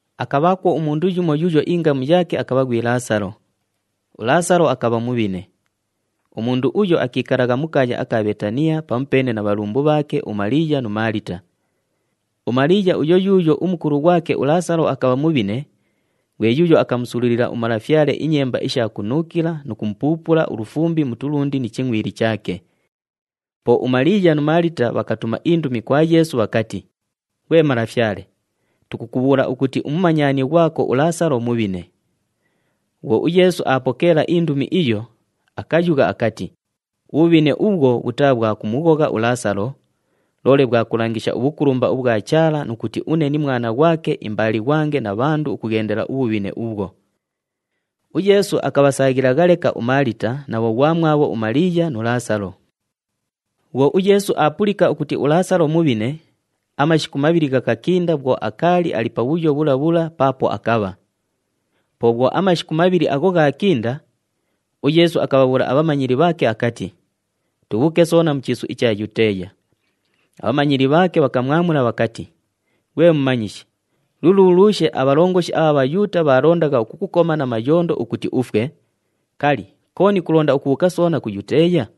Akabhaakwo umundu yumo yuuyo ingamu yaake akabha ghwi Laasalo. ULaasalo akabha mubhine. Umundu uyo akiikalagha mu kaaya aka Bheetaniya pamupeene na bhalumbu bhaake uMaliiya nu Maalita. UMaliiya uyo yuuyo umukulu ghwake uLaasalo akabha mubhine, ghwe yuuyo akamusululila uMalafyale inyemba isha kunuukila nu kumupuupula ulufumbi mu tulundi ni chingʼwili chaake. Po uMaliiya nu Maalita bhakatuma indumi kwa Yeesu bhakati, “Ghwe Malafyale, tukukubhuula ukuti umumanyani ghwako uLaasalo mubhine.” Bhwo uYeesu aapokeela indumi iyo, akayugha akati, “Ubhubhine ubhwo bhutaa bhwa kumughogha uLaasalo, loole bhwa kulangisha ubhukulumba ubhwa Chaala nu kuti une ni Mwana ghwake imbaalighwange na bhandu ukughendela ubhubhine ubhwo.” UYeesu akabhasaaghilagha leka uMaalita na bhoghwamwabho uMaliiya nu Laasalo. Bhwo uYeesu aapulika ukuti uLaasalo mubhine, amashiku mabhili ghakakinda bhwo akaali ali pabhuyo bhula bhula paapo akabha. Po bhwo amashiku mabhili agho ghaakinda, uYeesu akabhabhuula abhamanyili bhaake akati, “Tubhuuke soona mu chiisu icha Yuteeya.” Abhamanyili bhaake bhakamwamula bhakati, “Ghwe Mumanyishi, luluulushe abhalongoshi abha Bhayuuta bhaalondagha ukukukoma na mayondo ukuti ufwe, kali, kooni kulonda ukubhuuka soona ku Yuteeya?”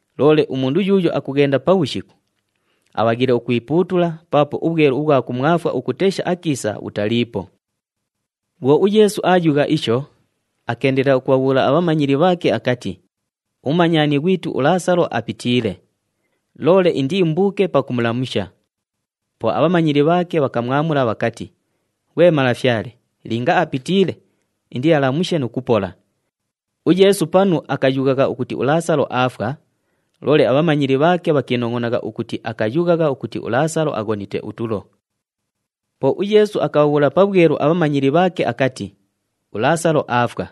Loole umundu yuuyo akughenda pabhushiku, abhaghiile ukwipuutula paapo ubhwelu ubhwa kumwafwa ukutesha akiisa bhutaliipo.” Bhwo uYeesu aayugha isho, akeendelela ukubhabhuula abhamanyili bhaake akati, “Umumanyani ghwitu uLaasalo apitiile, loole indiimbuuke pakumulamusha.” Po abhamanyili bhaake bhakamwamula bhakati, “Ghwe Malafyale, linga apitiile, indialamushe nu kupola.” UYeesu panu akayughagha ukuti uLaasalo aafwa, loole abhamanyili bhaake bhakiinongʼonagha ukuti akayughagha ukuti uLaasalo aghonite utulo. Po uYeesu akabhabhuula pabhwelu abhamanyili bhaake akati, “ULaasalo aafwa.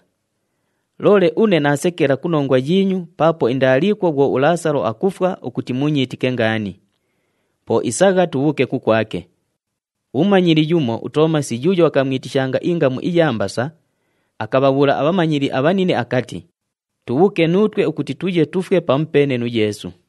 Loole une naasekela ku nongwa yiinyu paapo indaaliikwo bhwo uLaasalo akufwa ukuti muunyiitike ngaani. Po isagha, tubhuuke kukwake.” Umumanyili yumo uToomasi yuuyo bhakamwitishanga ingamu iya Mbasa, akabhabhuula abhamanyili abhanine akati, “Tubhuuke nuutwe ukuti tuye tufwe pamupeene nu Yeesu.”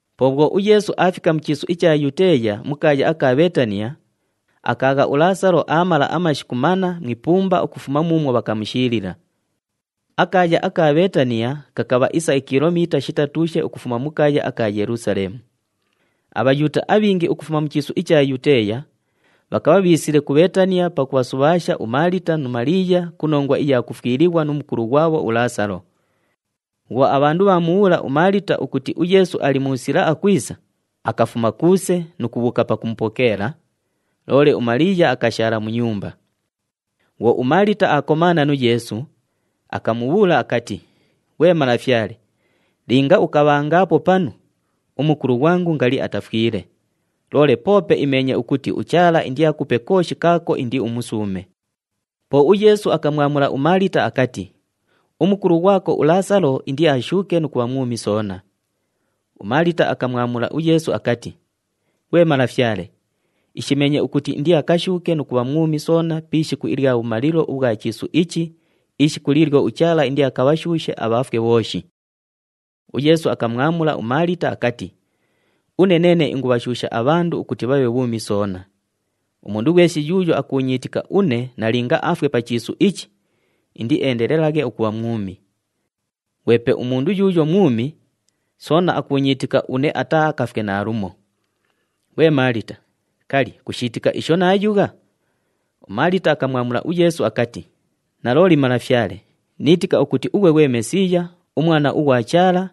Po bhwo uYeesu aafika mu chiisu icha Yuteeya mu kaaya aka Bheetaniya, akaagha uLaasalo aamala amashiku manna mu ipumba ukufuma muumwo bhakamushiilila. Akaaya aka Bheetaniya kakabha isa ikilomiita shitatuushe ukufuma mu kaaya aka Yelusaleemu. ABhayuuta abhingi ukufuma mu chiisu icha Yuteeya bhakabha bhiisile ku Bheetaniya pakubhasubhaasha uMaalita nu Maliiya ku nongwa iya kufwilighwa nu mukulu ghwabho uLaasalo. Bhwo abhandu bhaamubhuula uMaalita ukuti uYeesu ali mu sila akwisa, akafuma kuuse nu kubhuuka pakumupokeela, loole uMaliiya akashaala mu nyumba. Bhwo uMaalita aakomaana nu Yeesu, akamubhuula akati, “Ghwe Malafyale, linga ukabhangaapo panu, umukulu ghwangu ngali atafwile. Loole poope imeenye ukuti uChaala indiakupe kooshi kaako indiumusuume.” Po uYeesu akamwamula uMaalita akati, “Umukulu ghwako uLaasalo indiashuuke nu kubha mwumi soona.” UMaalita akamwamula uYeesu akati, “Ghwe Malafyale, ishimeenye ukuti indiakashuuke nu kubha mwumi soona pi ishiku ilya bhumalilo ubhwa chiisu ichi, ishiku liilyo uChaala indiakabhashuushe abhafwe bhooshi.” UYeesu akamwamula uMaalita akati, “Une neene ingubhashuusha abhandu ukuti bhabhe bhuumi soona. Umundu ghweshi yuuyo akuunyiitika une nalinga afwe pa chiisu ichi, indieendelelaghe ukubha mwumi. Ghwepe umundu yuuyo mwumi, soona akuunyiitika une ataaakafwe naalumo. Ghwe Maalita, kali, kushiitika isho naayugha?” UMaalita akamwamula uYeesu akati, “Nalooli Malafyale, niitika ukuti ughwe ghwe Mesiiya, uMwana ughwa Chaala,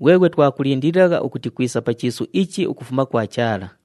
ghweghwe twakulindililagha ukuti kwisa pa chiisu ichi ukufuma kwa Chaala.”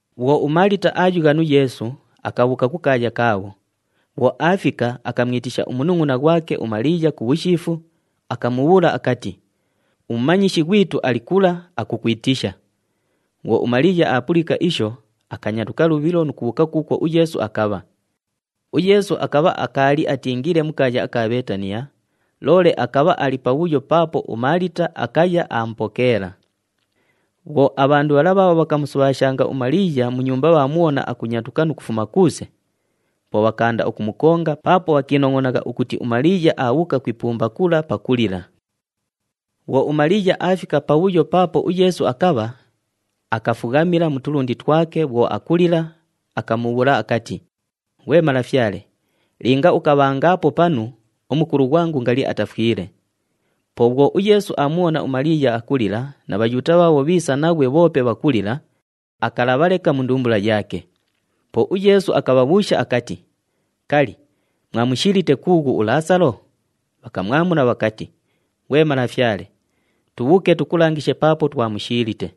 Bhwo uMaalita aayugha nu Yeesu, akabhuuka kukaaya kaabho. Bhwo aafika, akamwitisha umunungʼuna ghwake uMaliiya ku bhushiifu, akamubhuula akati, “UMumanyishi ghwitu ali kula, akukwitisha.” Bhwo uMaliiya aapulika isho, akanyatuka lubhilo nu kubhuuka kuukwo uYeesu akabha. UYeesu akabha akaali atiingiile mu kaaya aka Bheetaniya, loole akabha ali pabhuyo paapo uMaalita akaya aamupokeela. Bhwo abhandu bhala bhaabho bhakamusubhaashanga uMaliiya mu nyumba bhaamubhona akunyatuka nu kufuma kuuse, po bhakaanda ukumukonga paapo bhakiinongʼonagha ukuti uMaliiya aabhuuka ku ipumba kula pakulila. Bhwo uMaliiya aafika pabhuyo paapo uYeesu akabha, akafughamila mu tulundi twake bhwo akulila, akamubhuula akati, “Ghwe Malafyale, linga ukabhangaapo panu, umukulu ghwangu ngali atafwile.” Po bhwo uYeesu aamubhona uMaliiya akulila na Bhayuuta bhaabho bhiisa naghwe bhoope bhakulila, akalabha leka mu ndumbula yaake. Po uYeesu akabhabhuusha akati, “Kali, mwamushiilite kuughu uLaasalo?” Bhakamwamula bhakati, “Ghwe Malafyale, tubhuuke tukulangishe paapo twamushiilite.”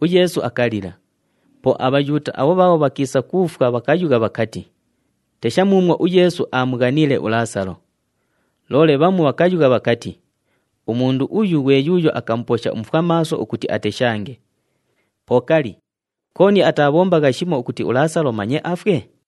UYeesu akalila. Po aBhayuuta abho bhaabho bhakiisa ku ifwa bhakayugha bhakati, “Tesha muumwo uYeesu aamughaniile uLaasalo!” Loole bhamu bhakayugha bhakati, “Umundu uyu ghwe yuuyo akamuposha umufwamaaso ukuti ateshange, po kali, kooni ataabhombagha shimo ukuti uLaasalo manye afwe?”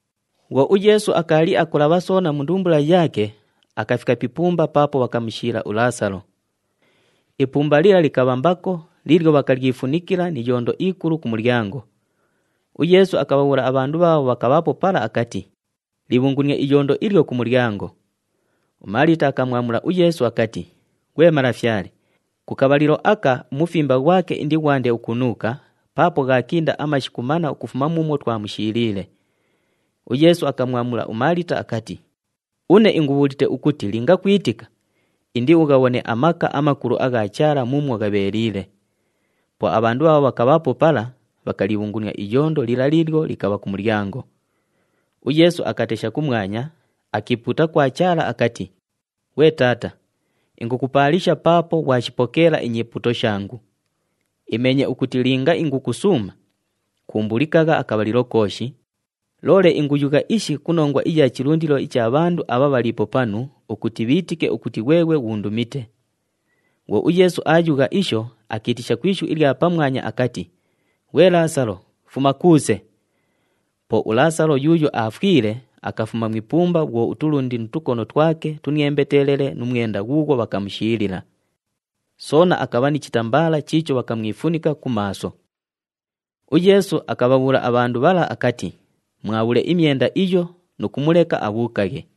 Bhwo uYeesu akaali akulabha soona mu ndumbula yaake, akafika pi ipumba paapo bhakamushiila uLaasalo. Ipumba lila likabha mbako liilyo bhakalyifunikila ni iyondo ikulu ku mulyango. UYeesu akabhabhuula abhandu bhaabho bhakabhaapo pala akati, “Libhungunie iyondo ilyo ku mulyango.” UMaalita akamwamula uYeesu akati, “Ghwe Malafyale, ku kabhalilo aka umufimba ghwake indighwande ukunuuka paapo ghaakinda amashiku manna ukufuma muumwo twamushiiliile.” UYeesu akamwamula uMaalita akati, “Une ingubhuulite ukuti linga kwitika, indiughabhone amaka amakulu agha Chaala muumwo ghabheeliile.” Po abhandu bhaabho bhakabhaapo pala, bhakalibhungunia iyondo lila liilyo likabha ku mulyango. UYeesu akatesha kumwanya, akiipuuta kwa Chaala akati, “Ghwe Taata, ingukupaalisha paapo ghwashipokeela inyipuuto shangu. Imeenye ukuti linga ingukusuuma, kuumbulikagha akabhalilo kooshi, loole inguyugha ishi ku nongwa iya chilundilo icha bhandu abha bhaliipo panu ukuti bhiitike ukuti ghweghwe ghuundumite.” Bhwo uYeesu aayugha isho, akiitisha ku ishu ilya pamwanya akati, “Ghwe Laasalo, fuma kuuse!” Po uLaasalo yuuyo aafwile, akafuma mu ipumba bhwo utulundi nu tukono twake tuniembetelele nu mwenda ghuughwo bhakamushiilila. Soona akabha ni chitambaala chiicho bhakamwifunika ku maaso. UYeesu akabhabhuula abhandu bhala akati, “Mwabhule imyenda iyo nu kumuleka abhuukaghe.”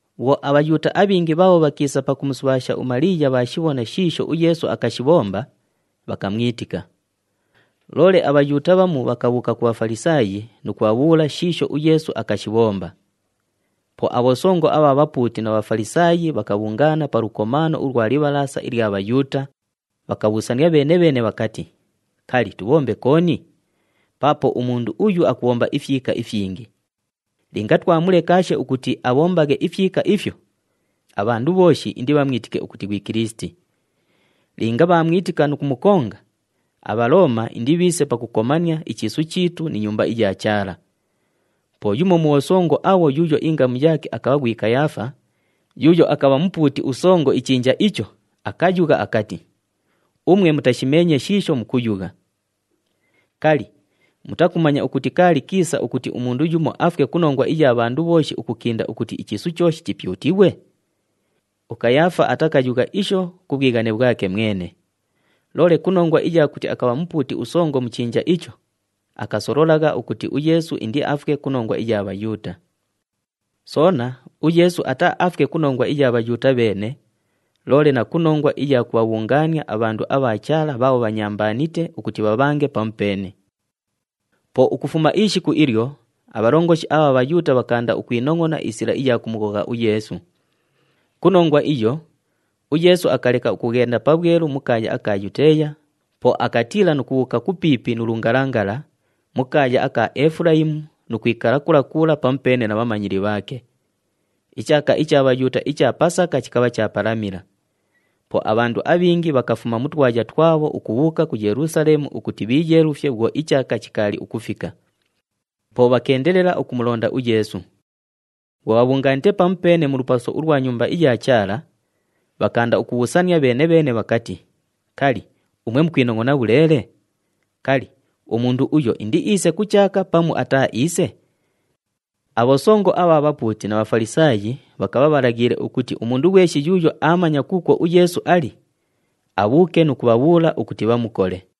Bhwo aBhayuuta abhingi bhaabho bhakiisa pakumusubhaasha uMaliiya bhaashibhona shiisho uYeesu akashibhomba, bhakamwitika. Loole aBhayuuta bhamu bhakabhuuka ku Bhafalisaayi nu kubhabhuula shiisho uYeesu akashibhomba. Po abhosongo abha bhapuuti na Bhafalisaayi bhakabhungaana pa lukomaano ulwa Libhalaasa ilya Bhayuuta, bhakabhuusania bheene-bheene bhakati, “Kali, tubhombe kooni? Paapo umundu uyu akubhomba ifyika ifyingi. Linga twamulekaashe ukuti abhombaghe ifyika ifyo, abhandu bhooshi indibhamwitike ukuti ghwi Kilisiti. Linga bhaamwitika nu kumukonga, aBhalooma indibhiise pakukomania ichiisu chiitu ni Nyumba iya Chaala.” Po yumo mu bhosongo abho yuuyo ingamu yaake akabha ghwi Kayaafa, yuuyo akabha mupuuti usongo ichinja icho, akayugha akati, “Umwe mutashimeenye shiisho mukuyugha! Kali, mutakumanya ukuti kaali kiisa ukuti umundu yumo afwe ku nongwa iya bhandu bhooshi ukukinda ukuti ichiisu chooshi chipyutighwe?” UKayaafa atakayugha isho ku bhwighane bhwake mwene. Loole ku nongwa iya kuti akabha mupuuti usongo mu chinja icho, akasololagha ukuti uYeesu indiafwe ku nongwa iya Bhayuuta. Soona, uYeesu ataaafwe ku nongwa iya Bhayuuta bheene, loole na ku nongwa iya kubhabhungaania abhandu abha Chaala bhaabho bhanyambaanite ukuti bhabhange pamupeene. Po ukufuma ishiku ilyo, abhalongoshi abha Bhayuuta bhakaanda ukwinongʼona isila iya kumughogha uYeesu. Ku nongwa iyo, uYeesu akaleka ukughenda pabhwelu mu kaaya aka Yuteeya, po akatiila nu kubhuuka kupiipi nu lungalangala, mu kaaya aka Efulayimu nu kwikala kula kula pamupeene na bhamanyili bhaake. Ichaaka icha Bhayuuta icha Pasaka chikabha chaapalamila. Po abhandu abhingi bhakafuma mu twaya twabho ukubhuuka ku Yelusaleemu ukuti bhiiyeelufye bhwo ichaaka chikaali ukufika. Po bhakeendelela ukumulonda uYeesu. Bhwo bhabhungaanite pamupeene mu lupaso ulwa Nyumba iya Chaala, bhakaanda ukubhuusania bheene-bheene bhakati, “Kali, umwe mukwinongʼona bhuleele? Kali, umundu uyo indiiise ku chaaka pamu ataaiise?” Abhosongo abha bhapuuti na Bhafalisaayi bhakabha bhalaghiile ukuti umundu ghweshi yuuyo aamanya kuukwo uYeesu ali, abhuuke nu kubhabhuula ukuti bhamukole.